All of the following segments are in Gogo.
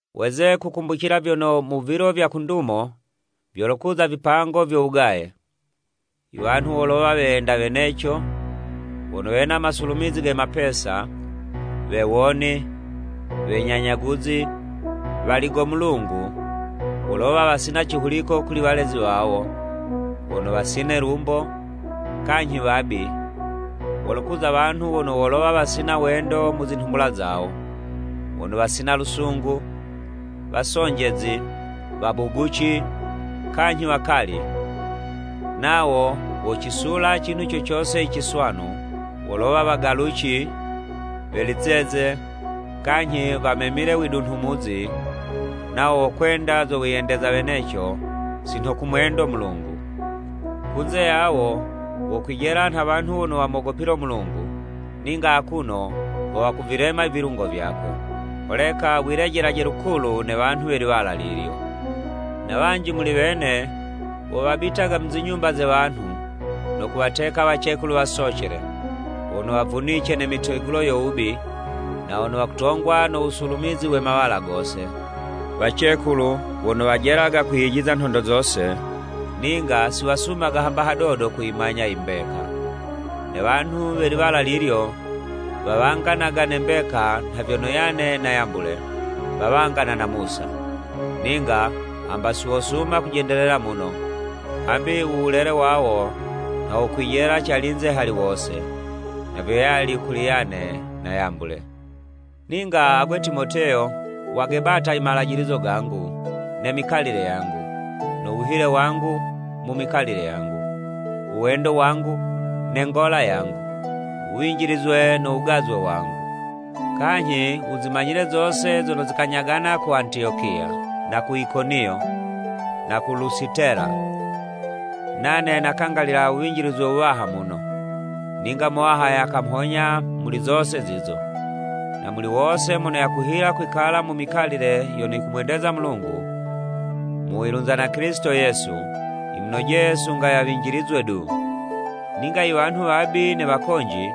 Weze kukumbucila vyono, mu vilo vya ku ndumo, vyolokuza vipango vyo wugaye. Iwanhu wolowa weyenda weneco, wono wena masulumizi ge mapesa, wewoni, wenyanyaguzi, waligo Mulungu, wolowa wasina cihuliko kuli walezi wawo, wono wasine 'lumbo, kanyhi wabi, wolokuza wanhu wono wolowa wasina wendo mu zinhumbula zawo, wono wasina lusungu, wasonjezi, wabuguci, kanyhi wakali, nawo wocisula cinhu co cose i ciswanu, wolowa wagaluci, we lizeze, kanyhi wamemile widunhumuzi, nawo wokwenda zo wiyendeza weneco, si nho kumwendo Mulungu. Kunze yawo wokwijela nha wanhu wono wamogopilo Mulungu, ninga akuno ho wakuvilema ivilungo vyakwe. Holeka wilejelaje lukulu ne wanhu we liwala lilyo. Na wanji muli wene, wo wabitaga mu zinyumba ze wanhu, no kuwateka wacekulu wasocele, wono wavunice ne mitegulo yo wubi, na wono wakutongwa no wusulumizi we mawala gose, wacekulu wono wajelaga kwiyijiza nhondo zose, ninga siwasumaga hamba hadodo kuyimanya i mbeka. Ne wanhu we liwala lilyo wawanganaga ne mbeka nha vyono Yane na Yambule, wawangana na Musa. Ninga hamba si wosuma kujendelela muno, hambi u wulele wawo nha wokwijela calinze hali wose. Na vyo yali kuli Yane na Yambule. Ninga agwe Timoteyo, wagebata i mejizo gangu, ne mikalile yangu, no wuhile wangu mu mikalile yangu, u wendo wangu, ne ngola yangu, wuwinjilizwe no wugazwe wangu. Kanyhi wuzimanyile zose zono zikanyagana ku Antiyokiya, na ku Ikoniyo, na ku Lusitela. Nane nakangalila wuwinjilizwe wuwaha muno! Ninga Muwaha yakamhonya muli zose zizo. Na muli wose mono yakuhila kwikala mu mikalile yono yikumwendeza Mulungu, mu wilunza na Kilisito Yesu, yimunojeye sunga yawinjilizwe du. Ninga i wanhu wabi ne wakonji,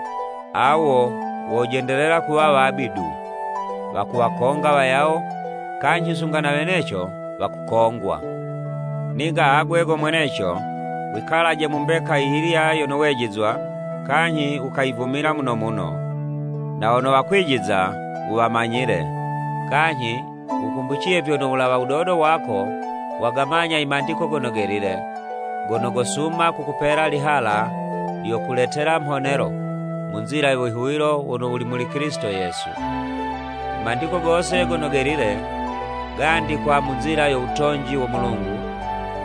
awo wojendelela kuwa wabi du, wakuwakonga wayawo, kanyhi sunga na weneco wakukongwa. Ninga agwe go mweneco, wikalaje mu mbeka yiyilya yono wejizwa kanyhi wukayivumila muno muno. Na wono wakwijiza wuwamanyile, kanyhi wukumbuciye vyono wulawa wudodo wako wagamanya i Mandiko Gono Gelile gono gosuma kukupela lihala lyono lyokuletela mhonelo mu nzila yo wihuwilo wono wuli muli Kilisito Yesu. I Mandiko gose Gono Gelile, gandikwa mu nzila yo wutonji wo Mulungu,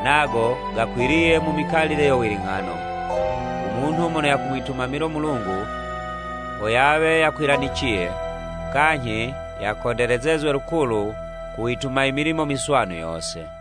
nago gakwiliye mu mikalile yo wiling'ano, u munhu mono yakumwitumamilo Mulungu ho yawe yakwilaniciye, kanyhi yakondelezezwe lukulu ku wituma i milimo miswanu yose.